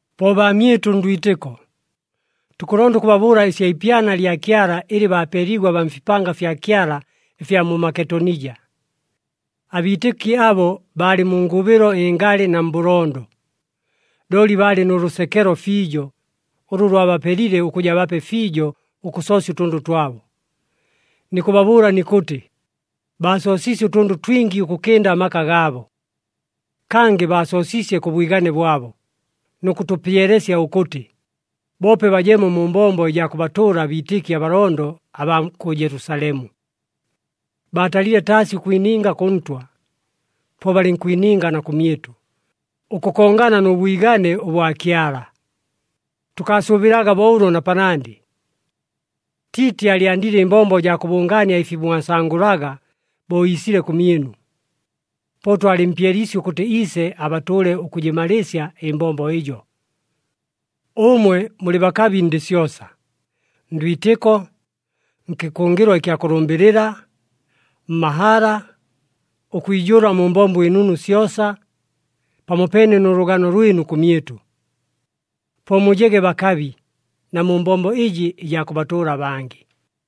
Po baamyɨtʉ ndwitɨko, tukʉlonda ʉkʉbabʉʉla ɨsya ipyana lya Kyala ɨlɨ bapeeliigwe abaa mfipanga fya Kyala ɨfya mu Maketonija. Abiitɨki abo baalɨ mu ngʉbɨlo ɨngalɨ na mbʉlondo, looli baalɨ nʉ lʉsekelo fiijo, ʉlʉ lwabapelile ʉkʉja bape fiijo ʉkʉsoosya ʉtʉndʉ twabo. Nikʉbabʉʉla nikʉtɨ, baasoosiisye ʉtʉndʉ twingi, ʉkʉkɨnda amaka gaabo. Kangɨ baasoosiisye kʉ bwigane bwabo, nʉ kʉtʉpyelesya ʉkʉtɨ, boope bajemo mu mbombo ɨjaa kʉbatʉʉla abiitɨki abalondo abaa kʉ Jelusalemu. Baatalile taasi ʉkwininga kʉ Ntwa, po balɨnkwininga na kʉmyɨtʉ, ʉkʉkongana nʉ bwigane ʉbwa Kyala. Tʉkaasʉʉbɨlaga bo ʉlo na panandɨ! Tiiti aalyandile ɨmbombo jaa kʉbʉngaania ɨfi mwasangʉlaga bo iisile kʉmyɨnu. Po twalɨmpyeliisye ʉkʉtɨ iise abatʉʉle ʉkʉjɨmalɨɨsya ɨmbombo ɨjo. Ʉmwe mulɨ bakabi ndɨ syosa, ndwitɨko, nkɨkʉngɨlwa ɨkya kʉlʉmbɨlɨla, mmahala, ʉkwijʉʉla mu mbombo ɨnunu syosa, pamopeene nʉ lʉgano lwɨnu kʉmyɨtʉ. Po mujege bakabi, na mu mbombo ɨjɨ ɨjaa kʉbatʉʉla abangɨ.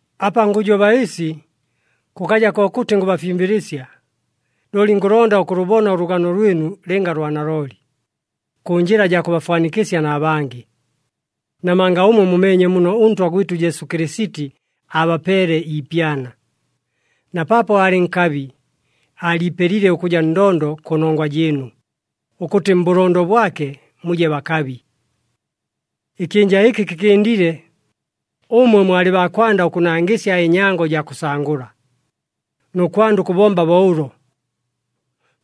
Apa ngʉjoba ɨsi, kʉkaja kokʉtɨ ngʉbafimbɨlɨsya, looli ngʉlonda ʉkʉlʉbona ʉlʉgano lwɨnu lɨnga lwa nalooli, kʉ njɨla jaa kʉbafwanikɨsya na bangɨ. Namanga ʉmwe mumeenye muno ʉNtwa gwɨtʉ Jesu Kɨlɨsiti aabapeele iipyana. Na paapo aalɨ nkabi, aaliipelile ʉkʉja ndondo kʉnongwa jɨɨnu, ʉkʉtɨ mbʉlondo bwake, muje bakabi. Ɨkyɨnja ɨkɨ kɨkɨndile, ʉmwe mwalɨ baa kwanda ʉkʉnangɨsya ɨnyango jaa kʉsangʉla, nʉ kwanda ʉkʉbomba bo ʉlo.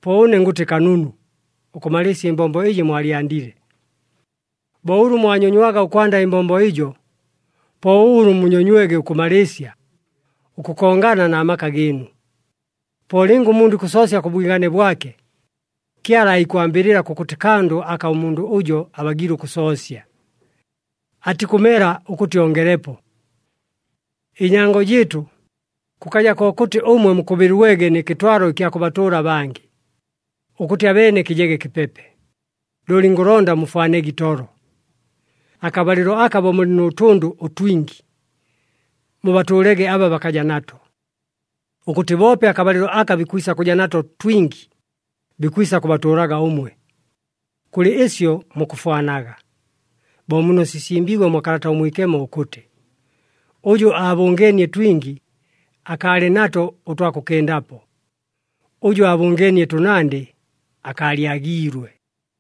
Po ʉne ngʉtɨ kanunu, ʉkʉmalɨɨsya ɨmbombo ɨjɨ mwalyandile. Bo ʉlʉ mwanyonywaga ʉkwanda ɨmbombo ɨjo, po ʉlʉ munyonywege ʉkʉmalɨɨsya, ʉkʉkongana na maka gɨɨnu. Po lɨnga ʉmundʉ ikʉsoosya kʉ bwigane bwake, Kyala aikwambɨlɨla kʉkʉtɨ kandʉ aka ʉmundʉ ʉjo abagiile ʉkʉsoosya. Atikʉmela ʉkʉtɨ ongelepo. Ɨnyango jɨɨtʉ, kʉkaja kokʉtɨ ʉmwe mukʉbɨlwegwe nɨ kɨtwalo ɨkya kʉbatʉʉla abangɨ, ʉkʉtɨ abeene kɨjege kɨpepe, looli ngʉlonda mufwanege itolo. Akabalɨlo aka bo mulɨ nʉ tʉndʉ ʉtwingi, mubatʉʉlege aba bakaja nato, ʉkʉtɨ boope akabalɨlo aka bikwisa kʉja nato twingi, bikwisa kʉbatʉʉlaga ʉmwe. Kʉlɨ ɨsyo mukʉfwanaga, bo muno sisimbiigwe mwa Kalata ʉMwikemo ʉkʉtɨ, “Ʉjʉ aabʉngeenie twingi, akaalɨ nato ʉtwa kʉkɨndapo, ʉjʉ aabʉngeenie tʉnandɨ akaalyagiilwe.”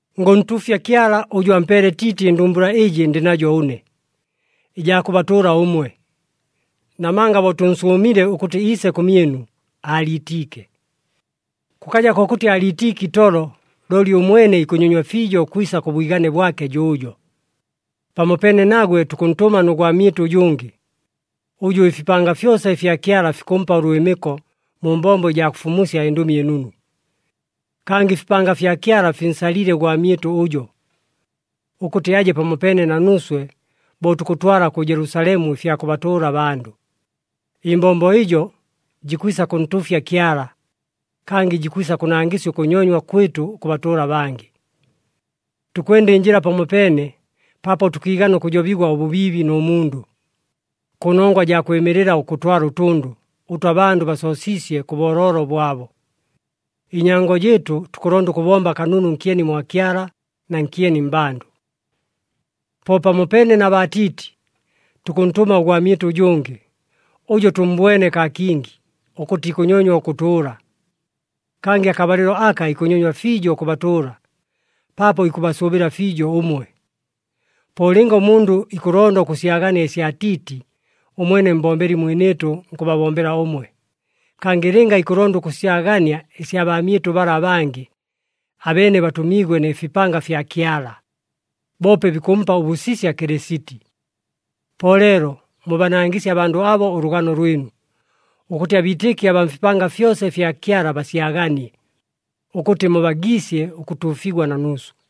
Ngʉntuufya Kyala ʉjʉ ampeele Tiiti ɨndumbula ɨjɨ ndɨ najo ʉne, ɨjaa kʉbatʉʉla ʉmwe. Namanga bo tʉnsʉʉmile ʉkʉtɨ iise kʉmyɨnu, aaliitiike. Kʉkaja kokʉtɨ aaliitiike itolo, looli ʉmwene ikʉnyonywa fiijo ʉkwisa kʉ bwigane bwake jʉʉjo. Pamopeene nagwe, tukʉntʉma nʉ gwamyɨtʉ ʉjʉngɨ, ʉjʉ ɨfipanga fyosa ɨfya Kyala fikʉmpa ʉlwɨmɨko mu mbombo ɨjaa kʉfumusya ɨNdʉmi ɨNunu. Kangɨ ɨfipanga ɨfya Kyala finsalile ʉgwamyɨtʉ ʉjo, ʉkʉtɨ aje pamopeene na nuuswe bo tukʉtwala kʉ Jelusalemu ɨfya kʉbatʉʉla abandʉ. Ɨmbombo ɨjo, jikwisa kʉntuufya Kyala, kangɨ jikwisa kʉnangɨsya ʉkʉnyonywa kwɨtʉ ʉkʉbatʉʉla abangɨ. Tukwenda ɨnjɨla pamopeene paapo tʉkiigana ʉkʉjobigwa ʉbʉbiibi nʉ mundʉ, kʉnongwa jaa kwɨmɨlɨla ʉkʉtwala ʉtʉndʉ, ʉtʉ abandʉ basoosiisye kʉ booloolo bwabo. Ɨnyango jɨɨtʉ, tukʉlonda ʉkʉbomba kanunu nkyeni mwa Kyala na nkyeni mmbandʉ. Po pamopeene na baa Tiiti, tukʉntʉma ʉgwamyɨtʉ ʉjʉngɨ. Ʉjo tʉmmbwene kaa kingi, ʉkʉtɨ ikʉnyonywa ʉkʉtʉʉla. Kangɨ akabalɨlo aka ikʉnyonywa fiijo ʉkʉbatʉʉla, paapo ikʉbasʉʉbɨla fiijo ʉmwe. Po lɨnga ʉmundʉ ikʉlonda ʉkʉsyagania ɨsya Tiiti, ʉmwene mbombeli mwinɨɨtʉ nkʉbabombela ʉmwe. Kangɨ lɨnga ikʉlonda ʉkʉsyagania ɨsya baamyɨtʉ bala abangɨ, abeene batʉmiigwe nɨ fipanga fya Kyala, boope bikʉmpa ʉbʉsisya Kɨlɨsiti. Po leelo, mubanangɨsye abandʉ abo ʉlʉgano lwɨnu, ʉkʉtɨ abiitɨki abaa mfipanga fyosa ɨfya Kyala basyaganie, ʉkʉtɨ mubagiisye ʉkʉtuufigwa na nuuswe.